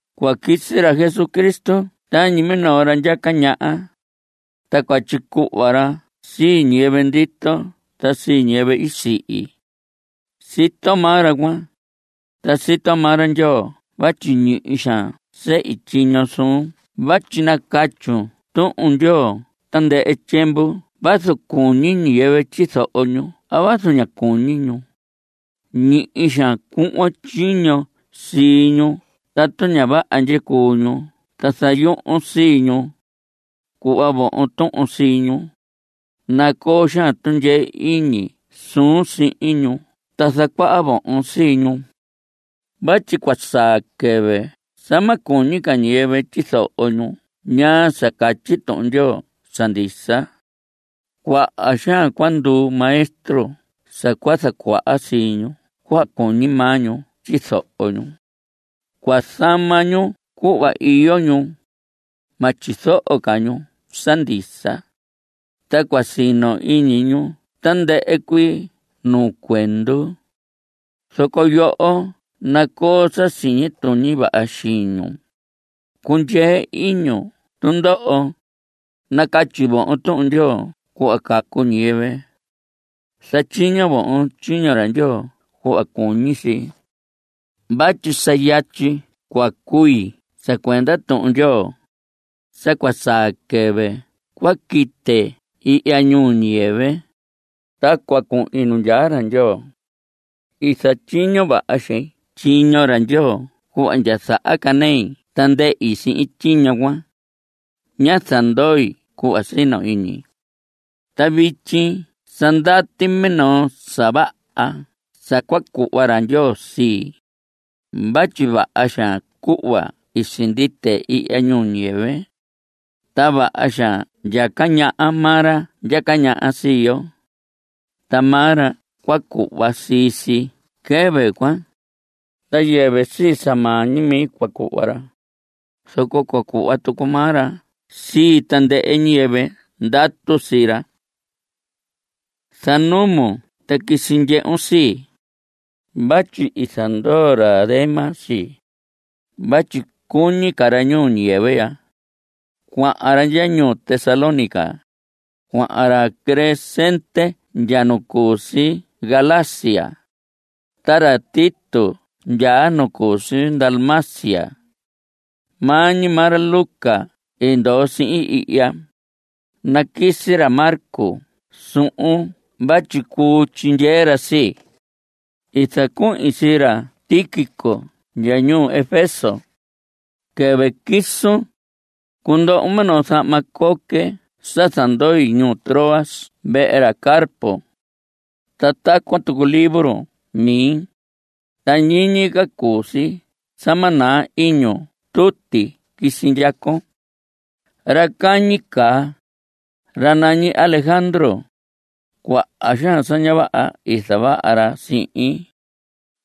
Cua quisi ra Jesucristo tañi minoo ra ndyaca ñaha, ta cua tyicuhva ra sii ñiyɨvɨ ndito ta ñiyɨvɨ i sihi. Sito maa ra cuan, ta sito maa ra Ndyoo vatyi ñihi xaan sehi tyiño suun vatyi nacatyun Tuhun Ndyoo tandɨhɨ tyiemvu vazu cuñi ñiyɨvɨ tyizoho ñu a vazu ña cuñi ñu. Ñihi xaan cuhvon tyiño sii ñu tatu ña vaha ndyicuu ñu ta zayuhun sii ñu. Cuhva vohon tuhun sii ñu. Nacoo xaan tundyee iñi suun sihin ñu ta zacuaha vohon sii ñu. Vatyi cua saa quɨvɨ sa ma cuñi ca ñiyɨvɨ tyizoho ñu ñaa sa catyi Tuhun Ndyoo sa ndisa. Cuaha xaan cua nduu maestro sa cua zacuaha sii ñu cuhva cuñi maa ñu tyizoho ñu. Cua zama ñu cuhva iyo ñu. Ma tyizoho ca ñu sa ndisa. Ta cua sino iñi ñu tandɨhɨ cuii nuu cuendu. Zoco yoho nacoo sa siñi tuñi vaha xiñun. Cundyee iñun tundoho. Nacatyi vohon Tuhun Ndyoo cuhva cacu ñiyɨvɨ. Zatyiño vohon tyiño ra Ndyoo cuhva cuñi si. Vatyi sa yatyi cua cui sa cuenda Tuhun Ndyoo. Sa cua saa quɨvɨ cua quite ihya ñuu ñiyɨvɨ, ta cua cuhin nu ndyaa ra Ndyoo. I zatyiño vaha xein tyiño ra Ndyoo cuhva ndya zahacanei ta ndehi sihin tyiño cuan. Ñá zandoi cuhva sino iñi. Ta vityi sa ndati minoo sa vaha sa cua cuhva ra Ndyoo sii, vatyi vaha xaan cuhva i sindite ihya ñuu ñiyɨvɨ. Ta vaha xaan ndyaca ñaha maa ra ndyaca ñaha sii yo. Ta maa ra cua cuhva sii si quɨvɨ cuan. Ta yɨvɨ sii sa maa ñi mi cua cuhva ra, zoco cua cuhva tucu maa ra sii tandɨhɨ ñiyɨvɨ ndatu sii ra. Zanumun ta quisi ndyehun sii. Vatyi i zandoo ra Demas sii, vatyi cuñi ca ra ñuu ñiyɨvɨ ya. Cuahan ra ndya ñuu Tesalónica. Cuahan ra Crescente ndya nu cu si Galacia. Ta ra Tito ndya nu cu si Dalmacia. Maa ñi maa ra Lucas i ndoo sihin ihya. Naquisi ra Marcos suhun vatyi cuu tyindyee ra sii. I zacuhin sii ra Tíquico ndya ñuu Efeso. Quɨvɨ quisun, cundohon minoo zahma coque sa zandoi ñuu Troas vehe ra Carpo. Ta tacuan tucu libro mi, ta ñiñi ca cuu si sa ma naa iñun tuti quisi ndyacon. Ra cañi caa, ra nañi Alejandro, cuaha xaan sa ña vaha i zavaha ra sihin.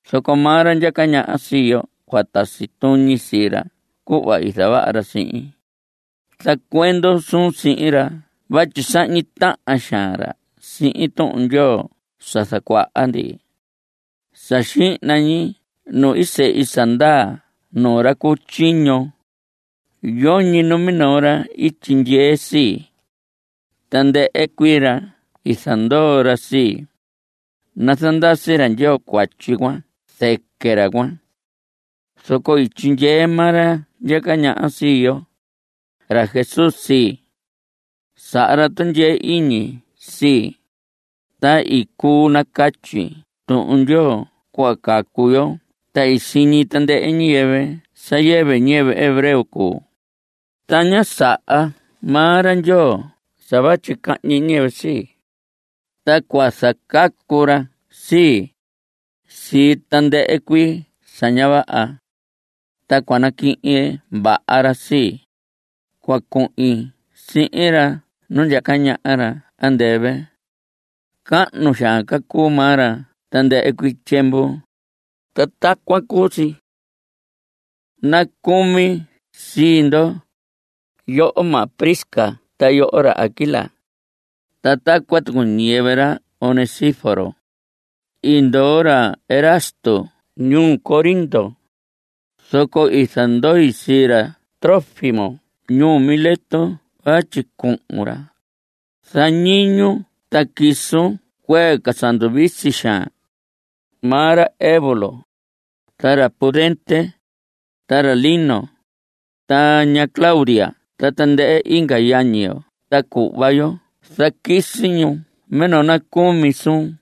Zoco maa ra ndyaca ñaha sii yo cua tasi tuñi sii ra cuhva i zavaha ra sihin. Zacuendon suun sihin ra vatyi sahñi tahan xaan ra sihin Tuhun Ndyoo sa zacuaha ndi. Sa xihna ñi nu sehi sa ndaa nuu ra cu tyiño, yoñi numinoo ra i tyindyee sii. Tandɨhɨ cuii ra i zandoo ra sii. Nazandasi ra Ndyoo cuatyi cuan zɨquɨ ra cuan. Zoco i tyindyee maa ra ndyaca ñaha sii yo, ra Jesús, sii. Saha ra tundyee iñi sii, ta i cuu nacatyi Tuhun Ndyoo cuhva cacu yo. Ta i siñi tandɨhɨ ñiyɨvɨ sa yɨvɨ ñiyɨvɨ hebreo cuu. Ta ñá saha maa ra Ndyoo sa vatyi cahñi ñiyɨvɨ sii. Ta cua zacacu ra sii, sii tandɨhɨ cuii sa ña vaha. Ta cua naquihin vaha ra sii, cua cuhin sihin ra nu ndyaca ñaha ra andɨvɨ. Cahnu xaan ca cuu maa ra tandɨhɨ cuii tyiemvu. Ta tacuan cuu si. Nacumi sii ndo, yoho maha Prisca ta yoho ra Aquila. Ta tacuan tucu ñiyɨvɨ ra Onesíforo. I ndoo ra Erasto ñuu Corinto. Zoco i zandoi sii ra Trófimo ñuu Mileto vatyi cuhu ra. Zañiñun ta quisun cuee ca sa nduvisi xaan. Maa ra Eubulo, ta ra Pudente, ta ra Lino, ta ña Claudia ta tandɨhɨ inga yañi yo ta cuhva yo zaquisi ñu minoo nacumi suun.